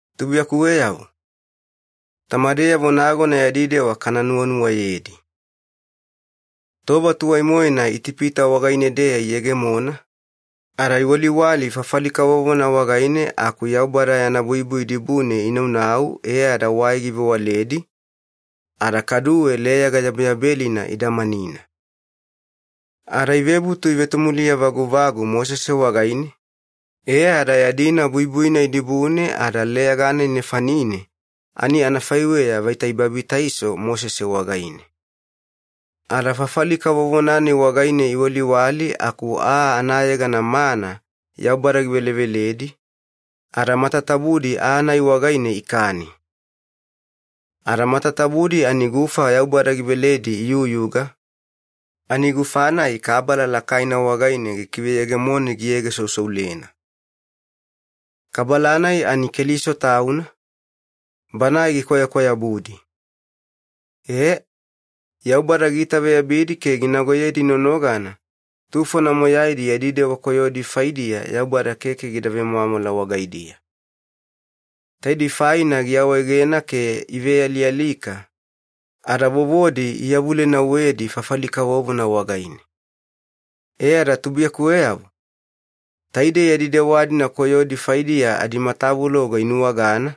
Tubuiyakuweyavo, tamadeyavo nagona yadi dewa kana nuwanuwayedi. Tova tuwai-moena Itipita wagaine-deya iyegemona, ada iwaliwali fafali kavovona wagaine aku Yaubada yana buibui dibune inaunau e ada wai givewaledi, ada kaduwe Leyaga Yabeyabelina idamanina. Ada ivebutu ivetomuliya vaguvagu Mosese wagaine, e ada yadina buibui-nai dibune ada Leyaga-nai nefanine ani anafaiweya vaita ibabitaiso Mosese wagaine. Ada fafali kavovona-nai wagaine iwaliwali aku aa anayegana ‘mana’ Yaubada giveleveledi, ada matatabudi aa-nai wagaine ikani. Ada matatabudi ani gufa Yaubada giveledi iyuyuga, ani gufa-nai Kabala lakaina wagaine gikiveyegemoni giyegesousoulena. Kabala-nai ani Keliso Tauna, Banae gikwayakwayabudi. E, Yaubada giitaveyabidi ke ginagoyedi nonogana tufona moyaidi yadi dewa koyodi faidiya Yaubada keke gida vemwamwala wagaidiya. Taidei faina giawaegena ke ivealialika, ada vovodi iyavulenauwedi fafali kavovona wagaine. E ada tubuiyakuweyavo, taidei yadi dewa-dina koyodi faidiya adimatavuloga inuwagana,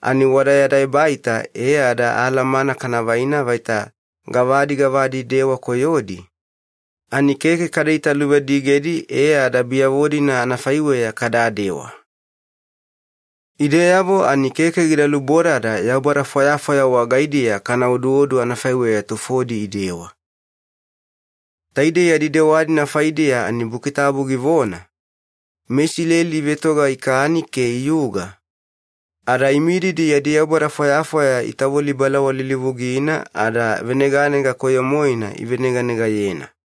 ani wada yada ebaita e ada alamana kana vaina vaita gavadi gavadi dewa koyodi, ani keke kada italuvadigedi e ada biyavo-dina anafaiweya kadadewa. Ideyavo ani keke gida lubodada yaubada fwayafwaya wagaidiya kana oduodu anafaiweya tufodi idewa. Taidei yadi dewa-dina faidiya ani Buki Tabu givona, “MeIsileli ivetoga ikani ke iyuga, ada imididi yadi yaubada fwayafwaya itavoli balawalilivugina ada veneganega koyo-moena iveneganegayena.”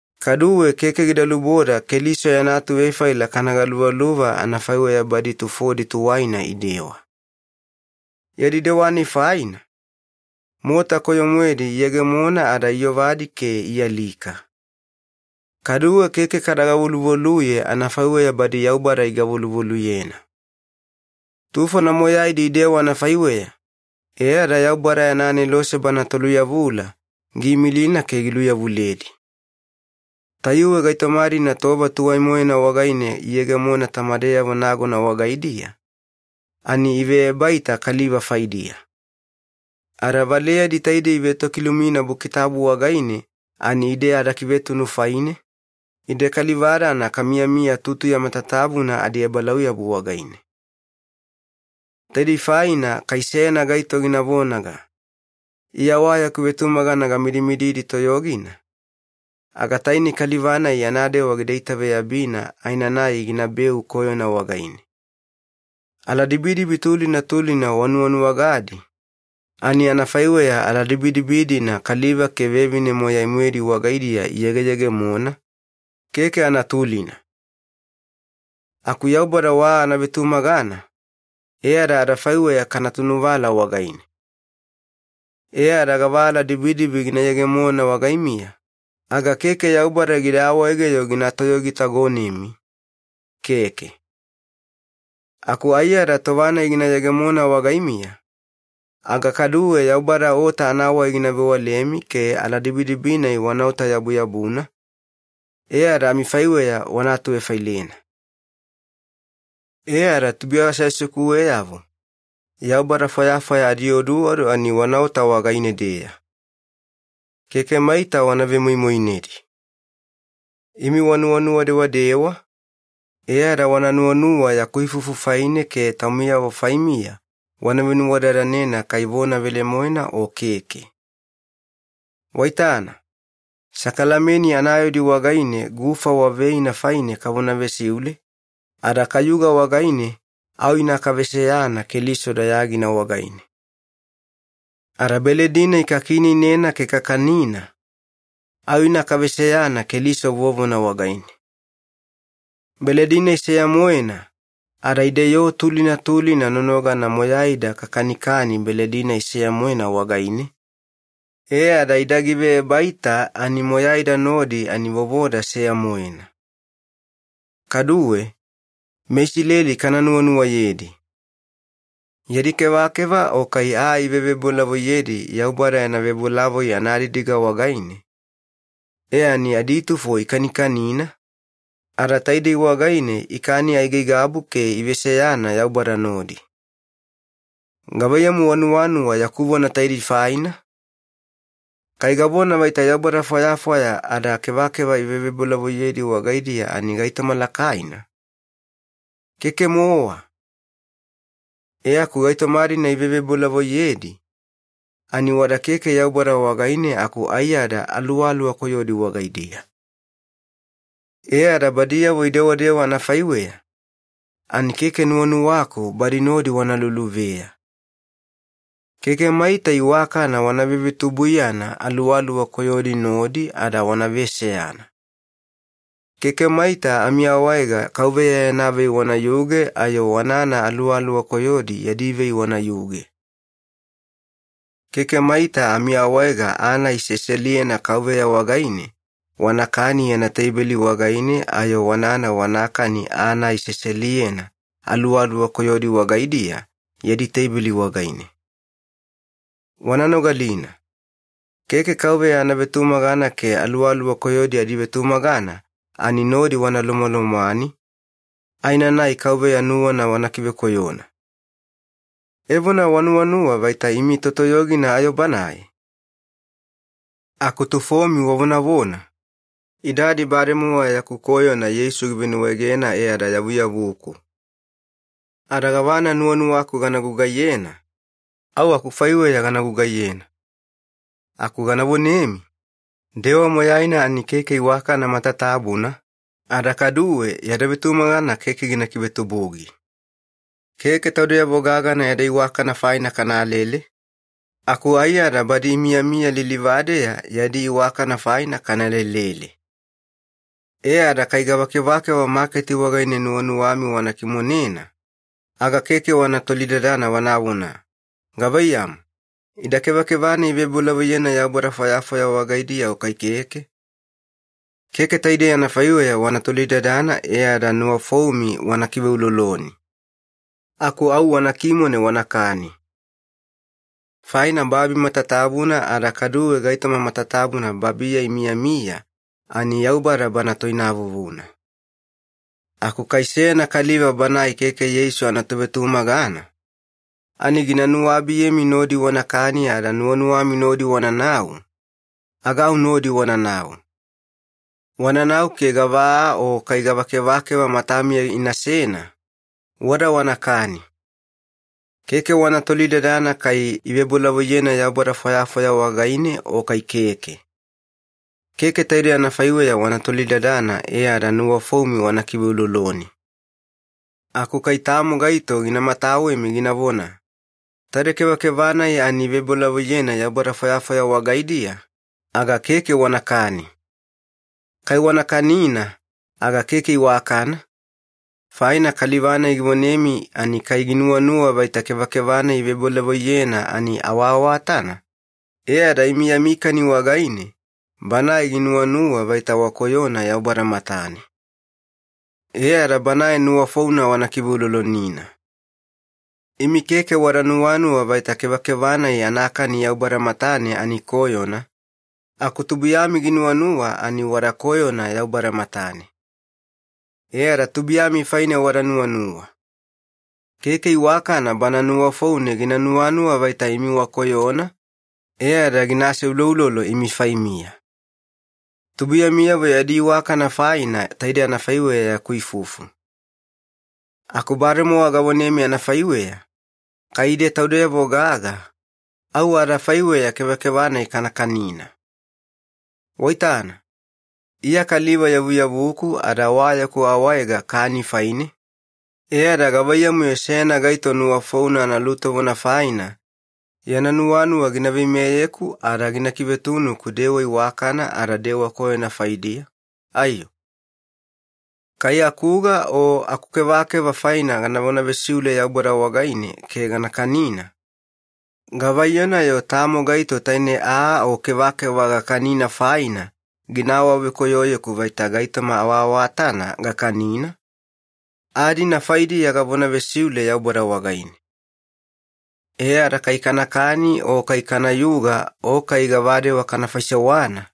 Kaduwe keke gida luboda Keliso yana atuvefaila kana galuvaluva anafaiweya badi tufodi tuwaina idewa. Yadi dewa-nai faina, mota koyo-moedi iyegemona ada iyovadi ke ialika. Kaduwe keke kada gavoluvoluye anafaiweya badi Yaubada igavoluvoluyena. Tufona moyaidi idewa anafaiweya, e ada Yaubada yana anelose bana toluyavula giimilina ke giluyavuledi. Tayuwe gaitoma-dina tova tuwai-moena wagaine iyegemona tamadeyavo nagona wagaidiya, ani iveebaita kaliva faidiya. Ada valeyadi taidei ivetokilumina Buki Tabu wagaine ani ide adakivetunu faine, ide kaliva-dana kamiyamiya tutuya matatabuna adiebalauyabu wagaine. Taidei faina kai seyana gaito gina vonaga, “Iya wa yaku vetumagana gamidimididi toyogina,” aga tainei kaliva-nai yana dewa gida itaveyabina aenanai ginabeu koyona wagaine. Aladibidibi tulina tulina wanuwanuwagadi, ani anafaiweya aladibidibi-dina kaliva ke vevine moyai-moedi wagaidiya iyegeyegemona, keke anatulina. Aku Yaubada wa anavetumagana, e ada adafaiweya kana tunuvala wagaine. E ada gava aladibidibi gina yegemona wagaimiya, aga keke Yaubada gida awaege-yo gina toyogitagonemi, keke. Aku aiyada tova-nai gina yegemona wagaimiya, aga kaduwe Yaubada ota anawai gina vewalemi ke aladibidibi-nai wanaota-yabuyabuna, e ada amifaiweya wana atuvefailena. E ada tubuiya aseasekuweyavo, yaubada fwayafwaya adioduodu ani wanaota wagaine-deya. Keke maita wana vemoimoinedi. Imi wanuwanuwa dewadewa, e ada wana nuwanuwa yaku ifufu faine ke taumiyavo faimiya wana venuwadadanena kai vona velemoena o keke. Waitana, sakalameni anayaudi wagaine gufa wa veina faina kavona vesiule, ada kayuga wagaine au ina kaveseyana Keliso dayagina wagaine. Ada beledi-nai kakiineinena ke kakanina, au ina kaveseyana Keliso vovona wagaine. Beledi ani seya-moena, ada ide yoo tulina tulina nonogana moyaida kakanikani beledi-nai seya-moena wagaine, e ada ida giveebaita ani moyaida nodi ani vovoda seya-moena. Kaduwe, meIsileli kana nuwanuwayedi. Yadi kevakeva o kai aa ivevebolavoiyedi Yaubada yana vebolavoi anadidiga wagaine, e ani aditufo ikanikanina, ada taidei wagaine ikani aigaigabu ke iveseyana Yaubada nodi. Gavaiyamu wanuwanuwa yaku vona taidei faina? Kai gavona vaita yaubada fwayafwaya ada kevakeva ivevebolavoiyedi wagaidiya ani gaitoma lakaina? Keke-mowa. E aku gaitoma-dina ivevebolavoiyedi, ani wada keke Yaubada wagaine aku aiyada aluwaluwa koyodi wagaidiya. E ada badiyavo idewadewa anafaiweya, ani keke nuwanuwaku badi nodi wana luluveya. Keke maita iwakana wana vevetubuiyana aluwaluwa koyodiyavo nodi ada wana veseyana. Keke maita amiawaega Kauveya yana vei wanayuge ayo wanana aluwaluwa koyodi yadi vei wanayuge. Keke maita amiawaega aa-nai seseliyena Kauveya wagaine wanakani yana teibeli wagaine ayo wanana wanakani aa-nai seseliyena aluwaluwa koyodi wagaidiya yadi teibeli wagaine. Wana nogalina, keke Kauveya anavetumagana ke aluwaluwa koyodi adivetumagana ani nodi wana lomwalomwani, aenanai Kauveya nuwana wana kivekoyona. Evona wanuwanuwa vaita imi totoyogina ayo Banae? Aku tufomi wavonavona, “Idadi bademowa yaku koyona Yeisu givenuwaegena e ada yavuyavuku. Ada gavana nuwanuwaku gana gugaiyena, au akufaiweya gana gugaiyena.” Aku gana vonemi, “Dewa moyaina ani keke iwakana matatabuna, ada kaduwe yada vetumagana keke gina kivetubugi.” Keke taudeyavo gagana yada iwakana faina kanalele, aku aiyada badi imiyamiya lilivadeya yadi iwakana faina kana lelele. E ada kai gava kevakeva maketi wagaine nuwanuwami wana kimonena, aga keke wana tolidadana wanavona, “Gavaiyamu, ida kevakeva ivebolavoiyena yaubada fwayafwaya wagaidiya o kai keke?” Keke taidei anafaiweya wana tolidadana e ada nuwafoumi wana kiveuloloni. Aku au wana kimone wanakani. Faina “babi matatabuna ada kaduwe gaitoma matatabuna babiya imiyamiya ani Yaubada Bana toinavuvuna.” Aku kai seyana kaliva banae keke Yeisu anatovetumagana, ani gina nuwabiyemi nodi wanakani ada nuwanuwami nodi wananau, aga au nodi wananau. Wananau ke gava aa o kai gava kevakeva matamiya inasena, wada wanakani. Keke wana tolidadana kai ivebolavoiyena yaubada fwayafwaya wagaine o kai keke. Keke taidei anafaiweya wana tolidadana e ada nuwafoumi wana kiveuloloni. Aku kai tamo gaito gina matawemi ginavona, “Taide kevakeva-nai ani ivebolavoiyena yaubada fwayafwaya wagaidiya,” aga keke wanakani. Kai wana kanina aga keke iwakana, faina kaliva-nai givonemi ani kai ginuwanuwa vaita kevakeva-nai ivebolavoiyena ani awaawatana, e ada imi yami kani wagaine banae ginuwanuwa vaita wakoyona Yaubada matane. E ada banae nuwafouna wana kiveulolonina. Imi keke wada nuwanuwa vaita kevakeva-nai anakani Yaubada matane ani koyona, aku tubuiyami ginuwanuwa ani wada koyona Yaubada matane. E ada tubuiyami faine wada nuwanuwa. Keke iwakana bana nuwafoune gina nuwanuwa vaita imi wakoyona e ada gina aseuloulolo imi faimiya. Tubuiyamiyavo yadi iwakana faina taide anafaiweya yaku ifufu. Aku bademowa gavonemi anafaiweya, kai ide taudeyavo gaga, au adafaiweya kevakeva-nai kana kanina. Waitana, Iya kaliva yavuyavuku ada wa yaku awaega kani faine, e ada gavaiyamu-yo seyana gaito nuwafouna analutovona faina yana nuwanuwa gina veimeyeku ada gina kivetunuku dewa iwakana ada dewa koyona faidiya, aiyo? Kai akuga o akukevakeva faina ganavona vesiule Yaubada wagaine ke gana kanina, gavaiyona-yo tamo gaito taine aa o kevakeva gakanina faina gina awavekoyoyeku vaita gaitoma awaawatana gakanina? Aa-dina faidiya gavona vesiule Yaubada wagaine. E ada kai kanakani o kai kanayuga o kai gavadewa kana faisewana,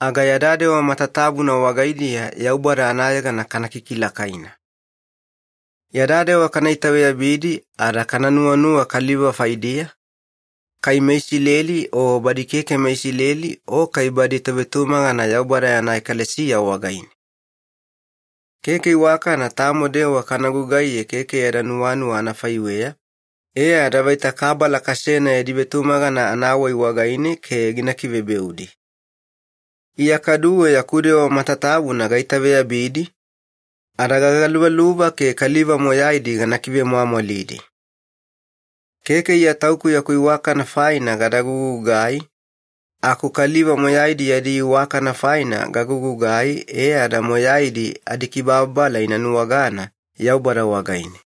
aga yada dewa matatabuna wagaidiya Yaubada anayegana kana kikilakaina. Yada dewa kana itaveyabidi ada kana nuwanuwa kaliva faidiya, kai meIsileli o badi keke meIsileli o kai badi tovetumagana Yaubada yana ekalesiya wagaine. Keke iwakana tamo dewa kana gugaiye keke yadi nuwanuwa anafaiweya, e ada vaita kabala kasena yadi vetumagana anawai wagaine ke gina kivebeudi. Iya kaduwe yaku dewa matatabuna gaitaveyabidi, ada gagaluvaluva ke kaliva moyaidi gana kivemwamwalidi. Keke Iya tauku yaku iwakana faina gada gugugai, aku kaliva moyaidi yadi iwakana faina gagugugai e ada moyaidi adikibababala ina nuwagana Yaubada wagaine.